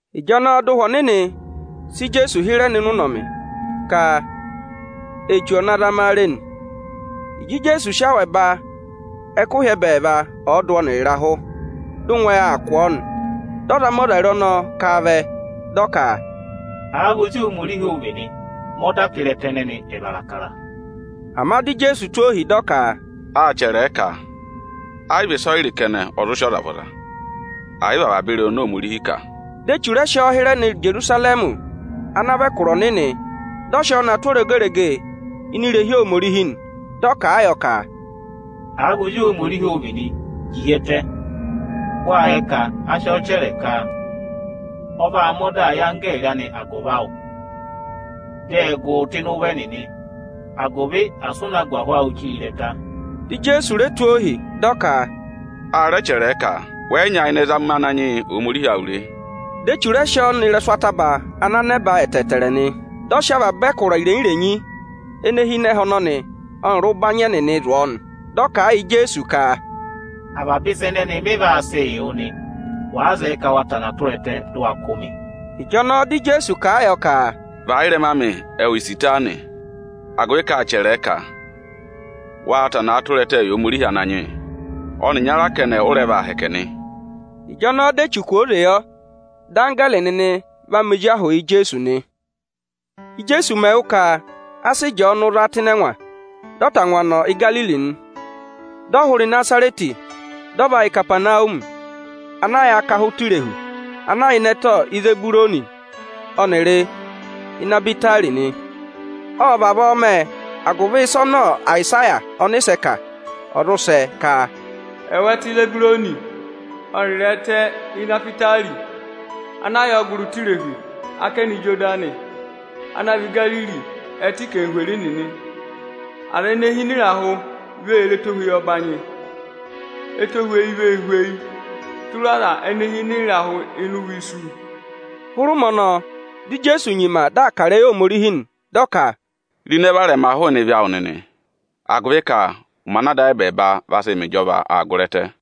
Ịjọnọọ dị Ụhwẹ Ọnịnị sị Ijeesu hịrẹ nọ ịnị ụnọmị ka Echu ọ̀ na zama a re nị. Ịjị Ijeesu sị awẹ ba ẹkụhị ẹbẹẹva ọọdụ ọnịrị ịrahụ, dị ụngwẹ aa kụ̀ ọ nị. Dị ọzamọzare ọnọọ ka a vẹ, dị ọ ka, “Àa vị Ozi Ohomorihi ụ vị nị, mẹ ọda ka ịrẹta ẹnẹnị ẹ̀ vara akara!” Ama dị Ijeesu tụ́ ohi, dị ọ ka, “Â chẹrẹ ẹ ka, ‘A yị vị ịsọyịrị kẹnẹ ọ zụ sị ọza yàra, ẹ̀ yị vị avaba ịrẹyị oni Ohomorihi kà.’” Dị Echu rẹ sị ọọ hịrẹ nọ Ijerusarẹmị ana vị ẹkụra ọnịnị, dị ọ sị ọọ na tụ́ oregerege ini irehi Ohomorihi nị. Dị ọ kà a yọ ka, “Àa vị Ozi Ohomorihi ụ vị nị, ji hi ẹtẹ! Wâ yẹ ka a sị ọọ chẹrẹ ka: ‘Ọ vaa mẹ ọdaa yị anggẹẹrị anị agụvị awụ, dị ẹ gụ wụ rị ụvọ, agụvị asị ụ na gù ahụ awụ chire ịrẹta.’” Dị Ijeesu re tụ́ ọọ ohi, dị ọ ka, “A rẹ chẹrẹẹ ka: ‘Wẹ yị nyayịnẹ zama Ananyị yị Ohomorihi awụ re!’” Dị Echu rẹ sị ọọ nọ ịrẹsụ ataba ana nẹba ẹtẹẹtẹrẹ nị, dị ọ sị avaba ẹkụra irenyi-irenyi ene hi ịnị ẹhẹ ọnọnị ọnịrị ụbanyị ẹnẹnị zụ̀ ọ nị. Dị ọ kà a yị Ijeesu ka, “Avaba ịsa ẹnẹnị mị vaa sịị yị wụ nị, wàa zẹẹ ka wa va ku ẹtẹ, dị ụ wa kụ́ mị.” Ịjọnọọ dị Ijeesu kà a yọ ka, “Và ị́rẹma amị, ẹwụ Isitani, agụvị ka â chẹrẹẹ ka: ‘Waa va ku ẹtẹẹ yị Ohomorihi Ananyị yị; ọnị ịnyara kẹnẹ ụ rẹ vaa hẹkẹ nị!’” Ịjọnọọ dị Echu kwooze yọ, dị anggẹẹrị nịnị vaa mẹ ozi ahụụ yị Ijeesu nị. Íjeesu mẹ̀ wụ́ ka a sị Ịjọọnụ za tụ́ ịnị ẹngwa, dị ọ tangwa nọ Igariri nị. Dị ọ hụrẹ Ịnazarẹtị, dị ọ va yà Ikapanawumi ana yà akaha ụtọ irehu, ana yà ịnị ẹtẹ Izeburuni ọnịrị Inahwitari nị. Ộ vavọọ mẹ agụvị ịsa ana Ayịsaya ọnịsẹ kà, ọ̀ zụ sẹ ka: “Ẹwụ ẹtẹ Izeburuni ọnịrị ẹtẹ Inahwitari ana yà ọgụrị ụtọ irehu, ákẹnẹ Ijodani, ana vị Igariri ẹtẹ anarịmadọwụ nịnị. Aza ene hi ịnị ịrahụ vee re ẹtohweyi ọbanyị. Etohweyi vee hweyii tụra aza ene hi ịnị ịrahụ ịnị ụvọ isu.” Hụrẹ ụmẹ ọnọọ, dị Ijeesu nyima dị aa kà ịrẹyị Ohomorihi nị. Dị ọ ka, “Ro ịnẹ varẹma hụụnị ịvị awụ nịnị, agụvị ka ụmẹ ana Ada ayị ẹbẹẹba vaa sị mẹ ịjọva aa gụrị ẹtẹ.”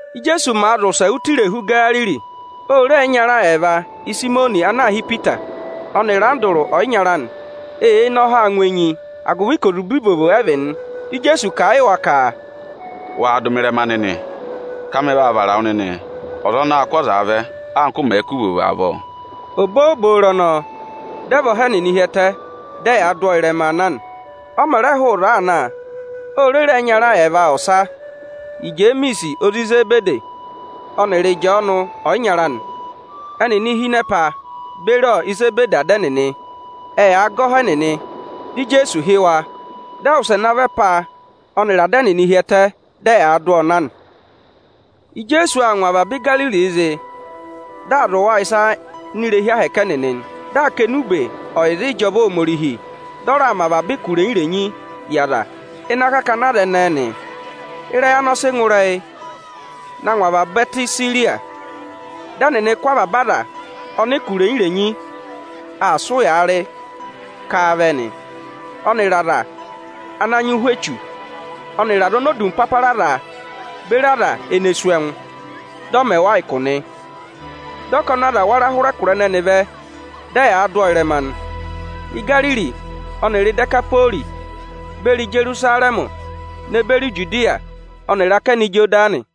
Ijeesu màa zị ụsẹ ụtọ irehu Igariri, ô re ẹyịnyara ẹẹva, Ịsayịmọnị ana aā hị́ Ipita, ọnịrị Andụrụ ọyịnyara anị. Eyee ne ọhaa ngụ enyi, agụvị ka ozube ivovo ẹ vị nị. Dị Ijeesu kà a yị wa ka, “Waa dụ mị ịrẹma nịnị, ka mị vaa vara wụ nịnị ọza anaā kụ́ azaa vẹ, anka ụ mẹ̀ẹ̄ kụ́ ivovo nịnị avọọ.” Obooboro ọnọọ, dị ẹ và ọha ẹnịnị hi ẹtẹ, dị ẹyaa dụ ọọ ịrẹmaa na nị. Ọ mẹ̀ rẹ hụụ ịzọọ aa na, o re re ẹyịnyara ẹẹva ọsa, Ijemiisi ozi Izebedi ọnịrị Ịjọọnụ ọyịnyara anị. Ẹnịnị hi ịnị ẹpa beri Izebedi ada ẹnịnị, ẹ yaa gẹ ọha ẹnịnị. Dị Ijeesu hị́ wa nị. Dị ẹ wụsẹ navọ ẹpa ọnịrị ada ẹnịnị hi ẹtẹ, dị ẹ yaa dụ ọọ na nị. Ijeesu aa ngụ avaba Igariri zị, dị aa zụ̀ wa ịsa ini irehi ahẹkẹ Aniju ẹnịnị, dị aa kà enube ọyịza ịjọva Ohomorihi, dị ọ raa mẹ avaba ụkụ irenyi-irenyi yị aza ịnị akakana aza ẹnẹẹ nị. Ịrẹyị anị ọ sị ngụ ịrẹyị na ngụ avaba ẹtẹ Isiriya. Dị ẹnịnị kụ́ avaba aza ọnị ụkụ irenyi-irenyi aa sị ụyaa rị ka a vẹ nị, ọnịrị aza ana nyị ụhwẹ echu, ọnịrị aza oni odumpapara aa za beri aza ene sú ẹngụ, dị ọ mẹ wa ụkụ nị. Dị ọkọnị aza wara hụrẹ ẹkụra ẹnẹnị vẹ, dị ẹ yaa dụ ọọ ịrẹma nị: Igariri ọnịrị Idekapori beri Ijerusarẹmị ne beri Ijudiya ọnịrị akẹnẹ Ijodani.